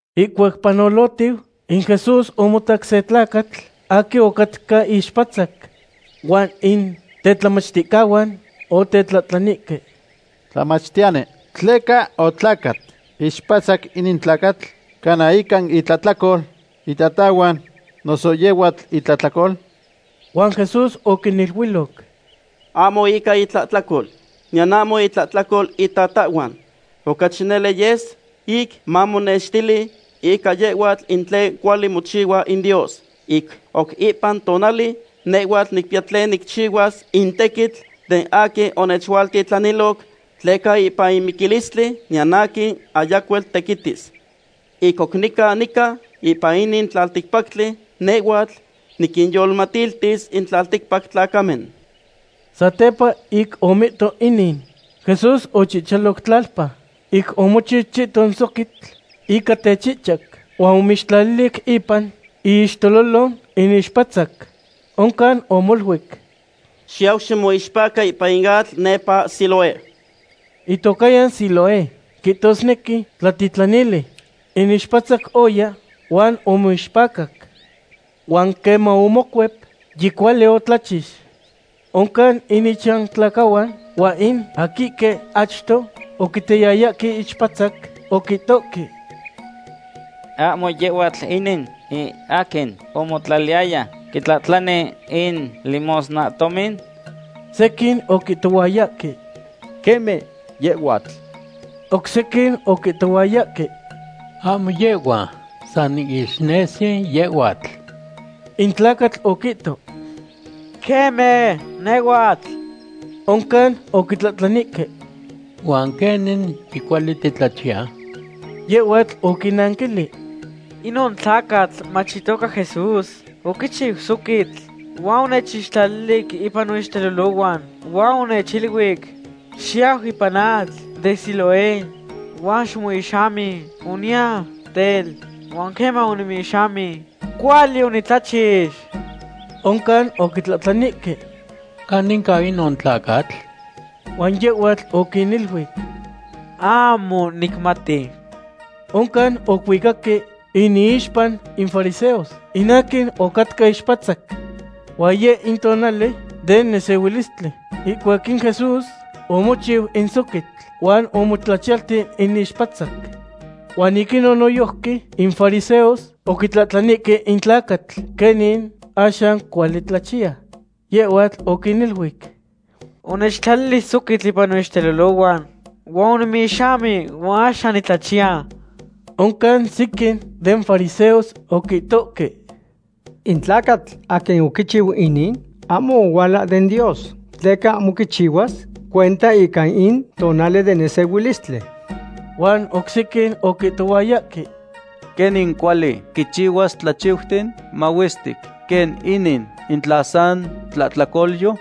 Ihcuac panolotiu, in Jesús omotac se tlacatl aquin otlacat ixpatzac. Huan in tetlamachticahuan otetlahtlanihque: ―Tlamachtiyani, ¿tleca otlacat ixpatzac inin tlacatl? ¿Cana ica intlahtlacol itatahhuan, noso yehhuatl itlahtlacol? Huan Jesús oquiniluiloc: ―Ahmo ica itlahtlacol, niyan ahmo intlahtlacol itatahhuan. Ocachi nele yes ic mamotenextili ica yehhuatl in tlen cuali mochihua in Dios. Ic oc ipan tonali, nehhuatl nicpiya tlen nicchihuas in tequitl den aquin onechualtitlaniloc, tleca ipan miquilistli, niyan aquin ayacuel tequitis. Ic oc nica nican ipan inin tlalticpactli, nehhuatl niquinyolmatiltis in tlalticpac tlacamen. Satepa ic omihto inin, Jesús ochihchaloc tlalpa, ic omochiu chihton soquitl ican techihchac, huan omixtlalili ipan iixtelolo in ixpatzac. Oncan omoluic: ―Xiyau ximoixpaca ipan in atl nepa Siloé. Itocahyan Siloé quihtosnequi Tlatitlanili. In ixpatzac oya huan omoixpacac. Huan queman omocuep, yicuali otlachix. Oncan in ichantlacahuan, huan in aquihque achto oquitayayahque ixpatzac, oquitohque: ―¿Ahmo yehhuatl inin in aquin omotlaliyaya quitlahtlani in limosnahtomin? Sequin oquihtohuayahque: ―Queme, yehhuatl. Oc sequin oquihtohuayahque: ―Ahmo yehhua, san ixnesi yehhuatl. In tlacatl oquihto: ―Queme, nehhuatl. Oncan oquitlahtlanihque: ―¿Huan queni yicuali titlachiya? Yehhuatl oquinnanquilic: ―Inon tlacatl mach itoca Jesús oquichiu soquitl, huan onechixtlalili ipan noixtelolohhuan, huan onechiluic: “Xiyau ipan in atl den Siloé huan ximoihxami.” Oniya, tel, huan queman onimoihxami, cuali onitlachix. Oncan oquitlahtlanihque: ―¿Caninca inon tlacatl? Huan yehhuatl oquiniluic: ―Ahmo nicmati. Oncan oquihuicaque inixpa in fariseos in aquin ocatca ixpatzac. Huan yeh in tonali den nesehuilistli ihcuac in Jesús omochiu in soquitl, huan omotlachiyalti in ixpatzac. Huan ic inon noyojqui in fariseos oquitlahtlanihque in tlacatl quenin axan cuali tlachiya. Yehhuatl oquiniluic: ―Onechtlalili soquitl ipan noixtelolohhuan, huan onimoihxami huan axan nitlachiya. Oncan sequin den fariseos oquihtoque: ―In tlacatl aquin oquichiu inin ahmo ohuala den Dios, tleca ahmo quichihuas cuenta ica in tonali den nesehuilistli. Huan oc sequin oquihtohuayahque: ―¿Quenin cuali quichihuas tlachiuten mahuestic quen inin in tla san tlahtlacolyo?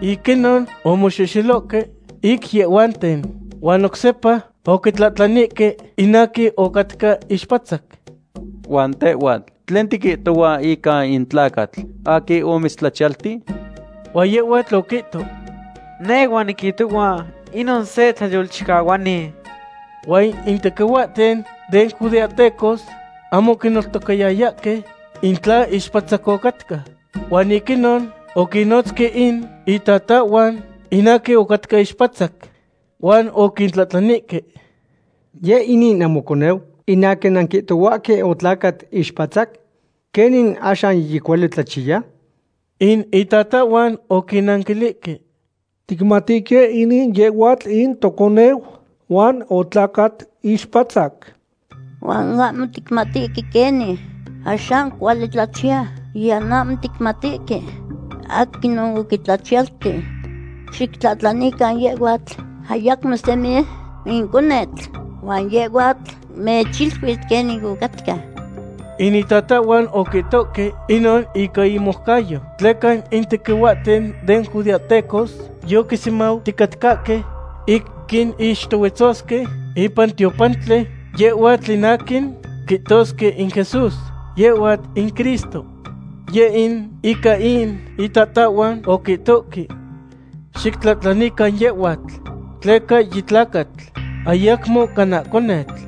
Ic inon omoxexelohque ic yehhuanten, huan oc sepa oquitlahtlanihque in aquin ocatca ixpatzac: ―¿Huan tehhuatl, tlen tiquihtohua ica in tlacatl aquin omitztlachiyalti? Huan yehhuatl oquihto: ―Nehhuatl niquihtohua inon se tlayolchicahuani. Huan in tequihuahten den judeahtecos ahmo oquineltocayayahque in tla ixpatzac ocatca. Huan ic inon oquinnotzque in itatahhuan in aquin ocatca ixpatzac. Huan oquintlahtlanihque: ―¿Yeh inin in namoconeu in aquin nanquihtohuahque otlacat ixpatzac? ¿Quenin axan yicuali tlachiya? In itatahhuan oquinnanquilihque: ―Ticmatihque inin yehhuatl in toconeu, huan otlacat ixpatzac. Huan ahmo ticmatihque quenin axan cuali tlachiya, niyan ahmo ticmatihque aquinon oquitlachiyalti. Xictlahtlanican yehhuatl; ayacmo semi in conetl, huan yehhuatl mechiluis quenin ocatca. In itatahhuan oquihtoque inon ica inmoucayo, tleca in tequihuahten den judeahtecos yoquisemauticatcahque ic quinquixtohuetzosque ipan tiopantli yehhuatl in aquin quihtosque in Jesús, yehhua in Cristo. Yeh in ica in itatahhuan oquihtoque: “Xictlahtlanican yehhuatl, tleca yitlacatl, ayacmo cana conetl.”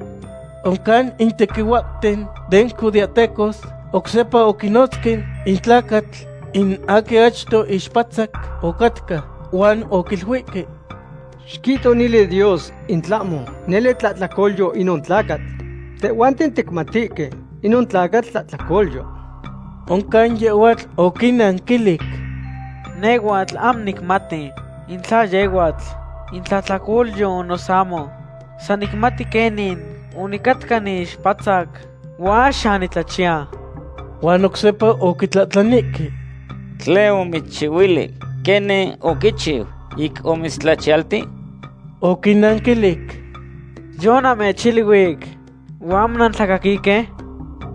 Oncan in tequihuahten den judeahtecos oc sepa oquinotzque in tlacatl in aquin achto ixpatzac ocatca, huan oquiluihque: ―Xiquihto nele Dios in tlahmo nele tlahtlacolyo inon tlacatl. Tehhuanten ticmatihque inon tlacatl tlahtlacolyo. Oncan yehhuatl oquinnanquilic: ―Nehhuatl ahmo nicmati in tla yehhuatl in tlahtlacolyo noso ahmo. San nicmati quenin onicatca niixpatzac huan axan nitlachiya. Huan oc sepa oquitlahtlanihque: ―¿Tlen omitzchihuilic? ¿Quenin oquichiu ic omitztlachiyalti? Oquinnanquilic: ―Yonamechiluic, huan ahmo nantlacaquihque.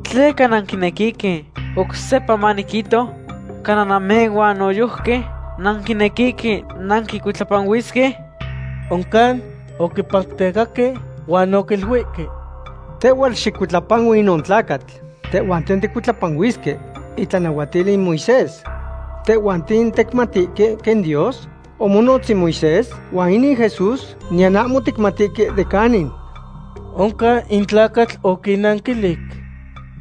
¿Tleca nanquinequihque oc sepa maniquihto? ¿Cana namehhuan noyojqui nanquinequihque nanquicuitlapanuisque? Oncan oquipactecahque huan oquiluihque: ―¡Tehhuatl xicuitlapanui inon tlacatl! Tehhuanten ticuitlapanuisque itlanahuatil in Moisés. Tehhuanten ticmatihque quen Dios omonotz in Moisés, huan inin Jesús, niyan ahmo ticmatihque de canin. Oncan in tlacatl oquinnanquilic: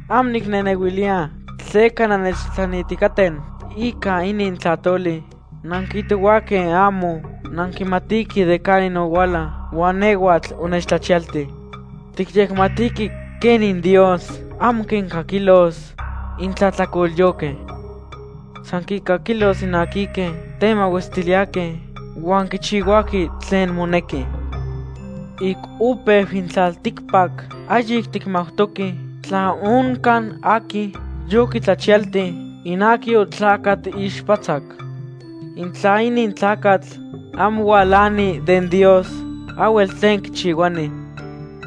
―Ahmo nicnehnehuiliya tleca nannechtlahtlanihticaten ica inin tlahtoli. Nanquihtohuahque ahmo nanquimatihque de canin ohuala, huan nehhuatl onechtlachiyalti. Ticyecmatihque quenin Dios ahmo quincaquilos in tlahtlacolyohque. San quincaquilos in aquihque temahuestiliyahque huan quichihuahque tlen monequi. Ic opeu in tlalticpac ahyic ticmautoque tla oncan aquin yoquitlachiyalti in aquin otlacat ixpatzac. In tla inin tlacatl ahmo hualani den Dios, ahhuel tlen quichihuani.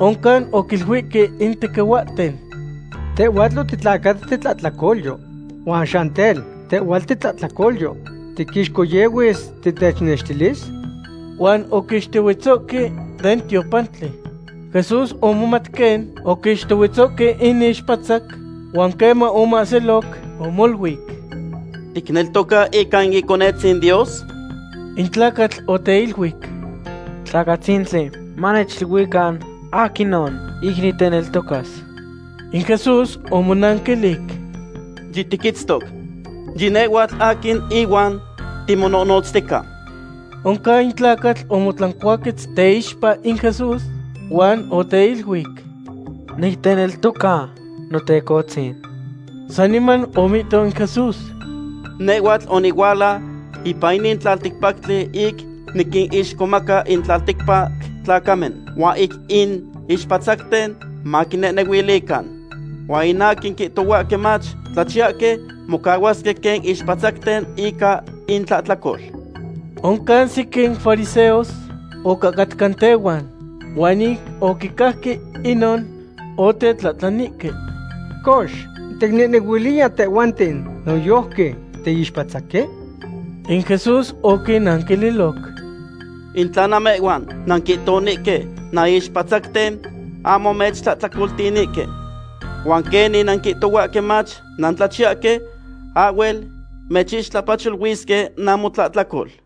Oncan oquiluihque in tequihuahten: ―Tehhuatl otitlacat titlahtlacolyo. Huan axan tel, ¿tehhuatl titlahtlacolyo tiixcohyehuis titechnextilis? Huan oquixtohuetzohque den tiopantli. Jesús omomat quen oquixtohuetzohque in ixpatzac, huan queman omoahsiloc, omoluic: ―¿Ticneltoca ica in Iconetzin Dios? In tlacatl oteiluic: ―Tlacatzintli, manechiluican aquinon, ic niteneltocas. In Jesús omonanquilic: ―Yitiquitztoc; yinehhuatl aquin ihuan timonohnotztica. Oncan in tlacatl omotlancuaquetz teixpa in Jesús, huan oteiluic: ―Nicneltoca, Notecohtzin. Saniman omihto in Jesús: ―Nehhuatl onihuala ipan inin tlalticpactli ic niquinixcomaca in tlalticpac tlacamen, huan ic in ixpatzacten maquinehnehuilican. Huan in aquin quihtohuahque mach tlachiyahque, mocahuasque quen ixpatzacten ica intlahtlacol. Oncan sequin fariseos ocahcatca tehuan, huan ic oquicajque inon, otetlahtlanihque: ―Cox, ¿ticnehnehuiliya tehhuanten noyojqui tiixpatzaque? In Jesús oquinnaquililoc: ―In tla namehhuan nanquihtonihque nanixpatzacten, ahmo mechtlahtlacoltihtonihque. Huan quenin nanquihtohuahque mach nantlachiyahque, ahhuel mechixtlapacholuisque namotlahtlacol.